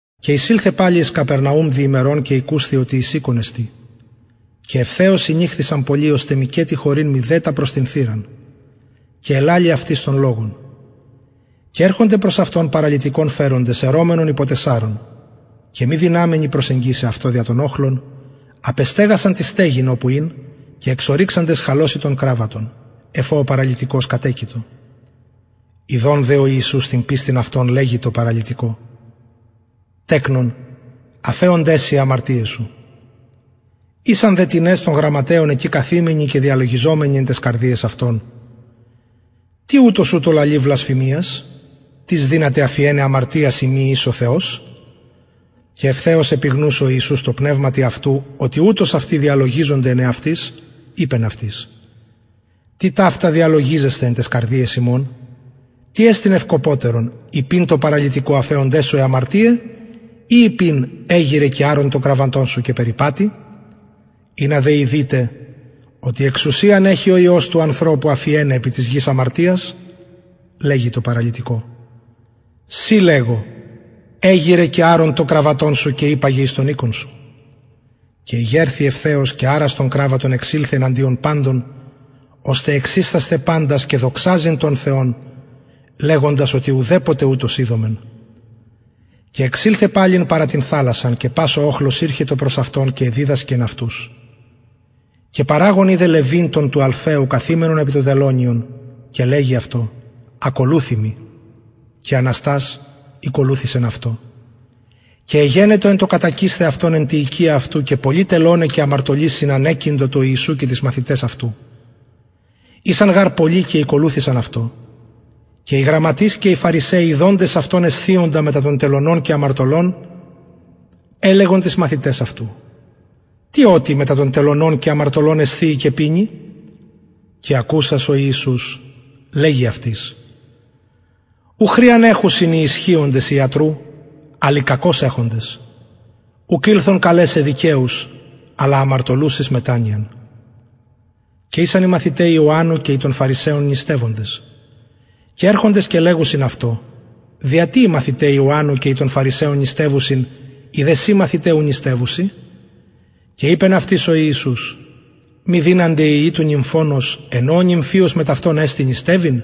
και εισηλθεν παλιν εις καπερναουμ δι ημερων και ηκουσθη οτι εις οικον εστιν και ευθεως συνηχθησαν πολλοι ωστε μηκετι χωρειν μηδε τα προς την θυραν και ελαλει αυτοις τον λογον και ερχονται προς αυτον παραλυτικον φεροντες αιρομενον υπο τεσσαρων και μη δυναμενοι προσεγγισαι αυτω δια τον οχλον απεστεγασαν την στεγην οπου ην και εξορυξαντες χαλωσιν τον κραββατον εφ ω ο παραλυτικος κατεκειτο ιδων δε ο ιησους την πιστιν αυτων λεγει τω παραλυτικω τεκνον αφεωνται σοι αι αμαρτιαι σου ησαν δε τινες των γραμματεων εκει καθημενοι και διαλογιζομενοι εν ταις καρδιαις αυτων τι ουτος ουτως λαλει βλασφημιας τις δυναται αφιεναι αμαρτιας ει μη εις ο θεος και ευθεως επιγνους ο ιησους τω πνευματι αυτου οτι ουτως αυτοι διαλογιζονται εν εαυτοις ειπεν αυτοις τι ταυτα διαλογιζεσθε εν ταις καρδιαις υμων τι εστιν ευκοπωτερον ειπειν τω παραλυτικω αφεωνται σου αι αμαρτιαι η ειπειν εγειραι και αρον σου τον κραββατον και περιπατει ινα δε ειδητε οτι εξουσιαν εχει ο υιος του ανθρωπου αφιεναι επι της γης αμαρτιας λεγει τω παραλυτικω σοι λεγω εγειραι και αρον τον κραββατον σου και υπαγε εις τον οικον σου και ηγερθη ευθεως και αρας τον κραββατον εξηλθεν εναντιον παντων ωστε εξιστασθαι παντας και δοξαζειν τον θεον λεγοντας οτι ουδεποτε ουτως ειδομεν και εξηλθεν παλιν παρα την θαλασσαν και πας ο οχλος ηρχετο προς αυτον και εδιδασκεν αυτους και παραγων ειδεν λευι τον του αλφαιου καθημενον επι το τελωνιον και λεγει αυτω ακολουθει μοι και αναστας ηκολουθησεν αυτω και εγενετο εν τω κατακεισθαι αυτον εν τη οικια αυτου και πολλοι τελωναι και αμαρτωλοι συνανεκειντο τω ιησου και τοις μαθηταις αυτου ησαν γαρ πολλοι και ηκολουθησαν αυτω και οι γραμματεις και οι φαρισαιοι ιδοντες αυτον εσθιοντα μετα των τελωνων και αμαρτωλων ελεγον τοις μαθηταις αυτου τι οτι μετα των τελωνων και αμαρτωλων εσθιει και πινει και ακουσας ο ιησους λεγει αυτοις ου χρειαν εχουσιν οι ισχυοντες ιατρου αλλ οι κακως εχοντες ουκ ηλθον καλεσαι δικαιους αλλα αμαρτωλους εις μετανοιαν και ησαν οι μαθηται ιωαννου και οι των φαρισαιων νηστευοντες και ερχονται και λεγουσιν αυτω δια τι οι μαθηται ιωαννου και οι των φαρισαιων νηστευουσιν οι δε σοι μαθηται ου νηστευουσιν και ειπεν αυτοις ο ιησους μη δυνανται οι υιοι του νυμφωνος εν ω ο νυμφιος μετ αυτων εστιν νηστευειν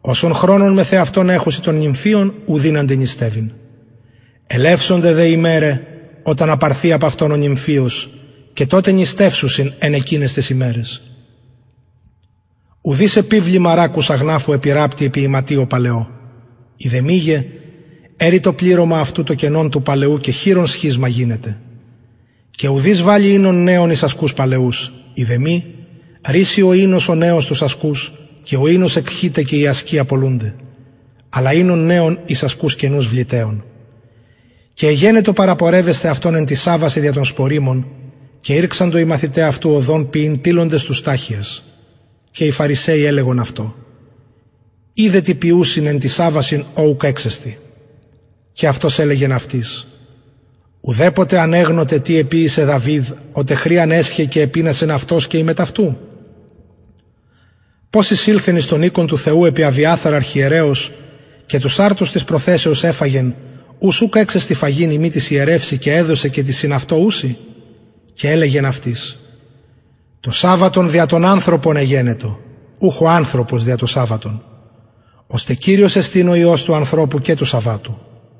οσον χρονον μεθ εαυτων εχουσιν τον νυμφιον ου δυνανται νηστευειν ελευσονται δε ημεραι οταν απαρθη απ αυτων ο νυμφιος και τοτε νηστευσουσιν εν εκειναις ταις ημεραις και ουδεις επιβλημα ρακους αγναφου επιρραπτει επι ιματιω παλαιω ει δε μη αιρει το πληρωμα αυτου το καινον του παλαιου και χειρον σχισμα γινεται και ουδεις βαλλει οινον νεον εις ασκους παλαιους ει δε μη ρησσει ο οινος ο νεος τους ασκους και ο οινος εκχειται και οι ασκοι απολουνται αλλα οινον νεον εις ασκους καινους βλητεον και εγενετο παραπορευεσθαι αυτον εν τοις σαββασιν δια των σποριμων και ηρξαντο οι μαθηται αυτου οδον ποιειν τιλλοντες τους σταχυας και οι φαρισαιοι ελεγον αυτω ιδε τι ποιουσιν εν τοις σαββασιν ο ουκ εξεστιν και αυτος ελεγεν αυτοις ουδεποτε ανεγνωτε τι εποιησεν δαυιδ οτε χρειαν εσχεν και επεινασεν αυτος και οι μετ αυτου πως εισηλθεν εις τον οικον του θεου επι αβιαθαρ αρχιερεως και τους αρτους της προθεσεως εφαγεν ους ουκ εξεστιν φαγειν ει μη τοις ιερευσιν και εδωκεν και τοις συν αυτω ουσιν και ελεγεν αυτοις το σαββατον δια τον ανθρωπον εγενετο ουχ ο ανθρωπος δια το σαββατον ωστε κυριος εστιν ο υιος του ανθρωπου και του σαββατου